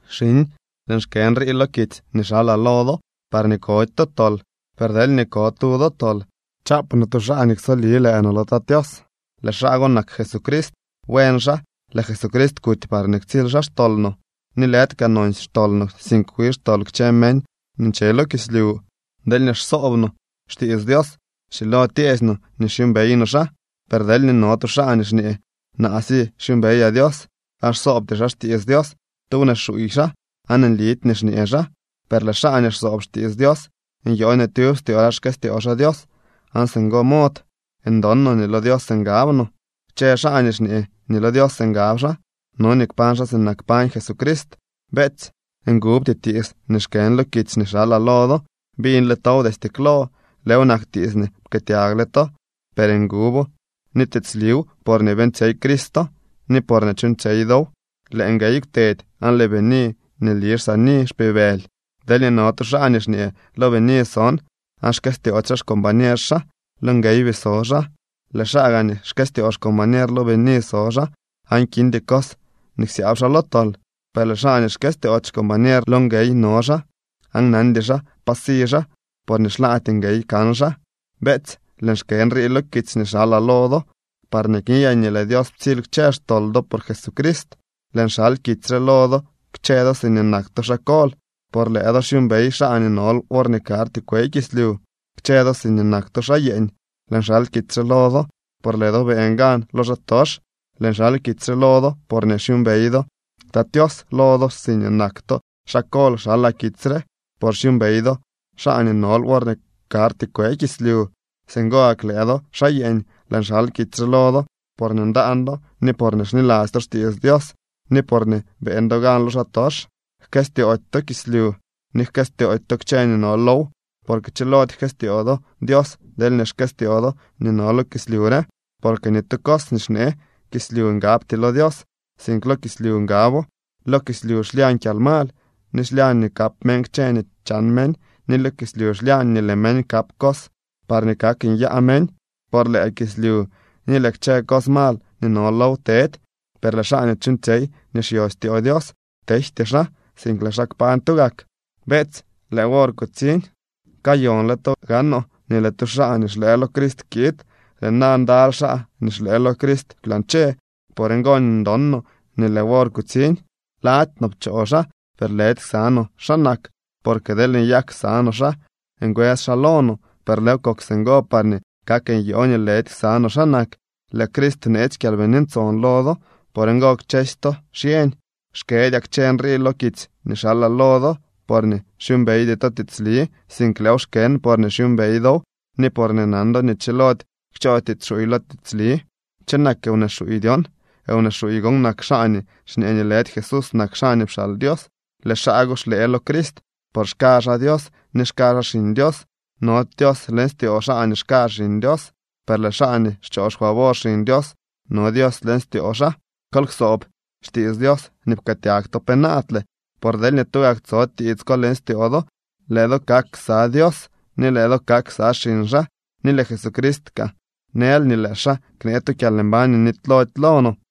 Xiñ, lëën xkë nrii lo kitsy nii xalaa lo do, parñee kody to tol. Per deelñee ko tu do tol, chaap no tu xaa nii ksoli lëë no lo Tat Tios, lëë xaa go nak Jesucrist. Buen xaa. Lëë Jesucrist kuty parñee ktsily xaa xtol no, ni lëdy kaa nonsy xtol no, sink wi xtol kchë meñ nii nche lo kislyu. Deelñee xsoob no xtiits Dios, schilo tyeesy no nii xyuumbey no xaa. Per deelñee no tu xaa nii xñee: “Naa si xyuumbeyaa Dios”, aan xsoobty xaa xtiits Dios, tu wnee xuuy xaa aan nlidy nii xñee xaa. Per lëë xaa nii xsoob xtiits Dios nyoo nii tyub styoo xaa xkëstyoo xaa Dios, aan singo mod ndon no nii lo Dios ngab no. Kchë xaa nii xñee nii lo Dios ngab xaa, no nii kpañ xaa sinak pañ Jesucrist. Beetsy, ngubty tiits nii xkën lo kitsy nii xalaa lo do. Biñle tow destye klo. Lëëw nak tiits nii pkëëtyagle to. Per ngubo ni tiitsliw porñee beeñtsyey Cristo ni porñee chuuñtsyey dow. Lëë nguey kwtedy aan lëë bini nii nli xsaani xpibëly. Deelñee no tu xaa nii xñee: “Lo bini son”, aan xkëstyoody xaa xcombañer xaa, lo nguey bii so xaa. Lëë xaa nii gaa xkëstyoo xcombañer lo bini so xaa, aan kindy cos nii ksyaab xaa lo tol. Per lëë xaa nii xkëstyoody xcombañer lo nguey no xaa, aan nandy xaa pa si xaa, porñee xlaady nguey kan xaa. Beetsy, lëën xkë nrii lo kitsy nii xalaa lo do parñee kniyaa nii lëë Dios ptsily kchë xtol do por Jesucrist. Lëën xal kitsy re lo do kchë do siñee nak to xaa kol, por lëë do xyuumbey xaa nii nol worñee karty kwe kislyu. Kchë do siñee nak to xaa yeeñ, lëën xal kitsy re lo do por lëë do beeñ gan lo xaatox. Lëën xal kitsy re lo do porñee xyuumbey do Tat Tios. Lo do siñee nak to xaa kol xalaa kitsy re, por xyuumbey do xaa nii nol worñee karty kwe kislyu. Singo gak lëë do, xaa yeeñ, lëën xal kitsy re lo do porñee ndaan do ni porñee xniladzy to xtiits Dios ni porñee beeñ do gan lo xaatox. Jkëstyoody to kislyu ni jkëstyoody to kchë nii no low. Porque chilody jkëstyoo do Dios deelñee xkëstyoo do nii no lo kislyu re. Porque ni tu cos nii xnee kislyu ngabty lo Dios, sink lo kislyu ngabo. Lo kislyu xlyañ kyalmal, ni xlyañ nii kap meñ kchë nii chan meñ, ni lo kislyu xlyañ nii lëë meñ kap cos parñee kak nyaa meñ. Por lëë kislyu ni lëë kchë cos mal nii no low tedy, per lëë xaa nii chuuñtsyey nii xyo styoo Dios tejty xaa, sink lëë xaa kpañ tugak. Beetsy, lëë wor kutsiñ. Kayonle to gaanoo nii lëë tu xaa nii xlëë lo Crist kiid. Lëë na ndaly xaa nii xlëë lo Crist kwlañche. Por ngo nii ndon no nii lëë wor kutsiñ. Lady no pchoo xaa, per lëdy ksa no xaa nak, porque deel nyak ksa no xaa, ngwës xaa lo no. Per lëëw kok singo parñee kak nyoo nii lëdy ksa no xaa nak. Lëë Crist bneetsy Kyalbini Ntson lo do. Por ngo kchësy to xyeñ. Xkëdyaa kchë nrii lo kitsy nii xalaa lo do, porñee xyuumbeydy to tiitsli, sink lëëw xkën porñee xyuumbey dow ni porñee nan do nii chilody kchoo tiits xuuy lo tiitsli. ¿Cho nak wnee xuuy dyon? Wnee xuuy gon nak xaa nii xñee nii lëdy Jesús nak xaa nii pxaal Dios. Lëë xaa go xlëë lo Crist, por xka xaa Dios ni xka xaa Xiñ Dios. Nody Dios leñ styoo xaa nii xka Xiñ Dios, per lëë xaa nii xchoo xfavor Xiñ Dios, no Dios leñ styoo xaa. Kol ksoob xtiits Dios nii pkëëtyag to penaadle. Por deelñee tugak tso tiits ko leñ styoo do, lëë do kak ksa Dios ni lëë do kak ksa xiñ xaa. Ni lëë Jesucrist kaa nël nii lëë xaa knee tu kyalmbañ nii nitylody lo no.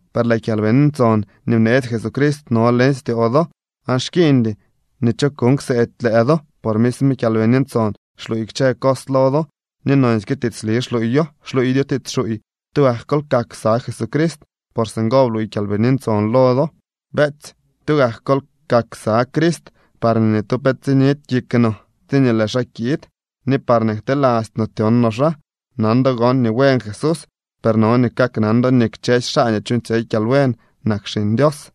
Per lëë Kyalbini Ntson nii bneetsy Jesucrist no leñ styoo do, aan xkiiñdy nii cho kuuñ kseedy lëë do, por misme Kyalbini Ntson xluuy kchë cos lo do, ni nonsyke tiitsli xluuyo. Xluuydyo tiits xuuy. Tugak kol kak ksa Jesucrist por singo bluuy Kyalbini Ntson lo do. Beetsy, tugak kol kak ksa Crist parñee ni tu pe tsinidy kik no tsiñee lëë xaa kiid, ni parñee ktelasty no tyon no xaa. Nan do gon nii buen Jesús, per no nii kaknan do nii kchësy xaa nii chuuñtsyey kyalbuen nak xiñ Dios.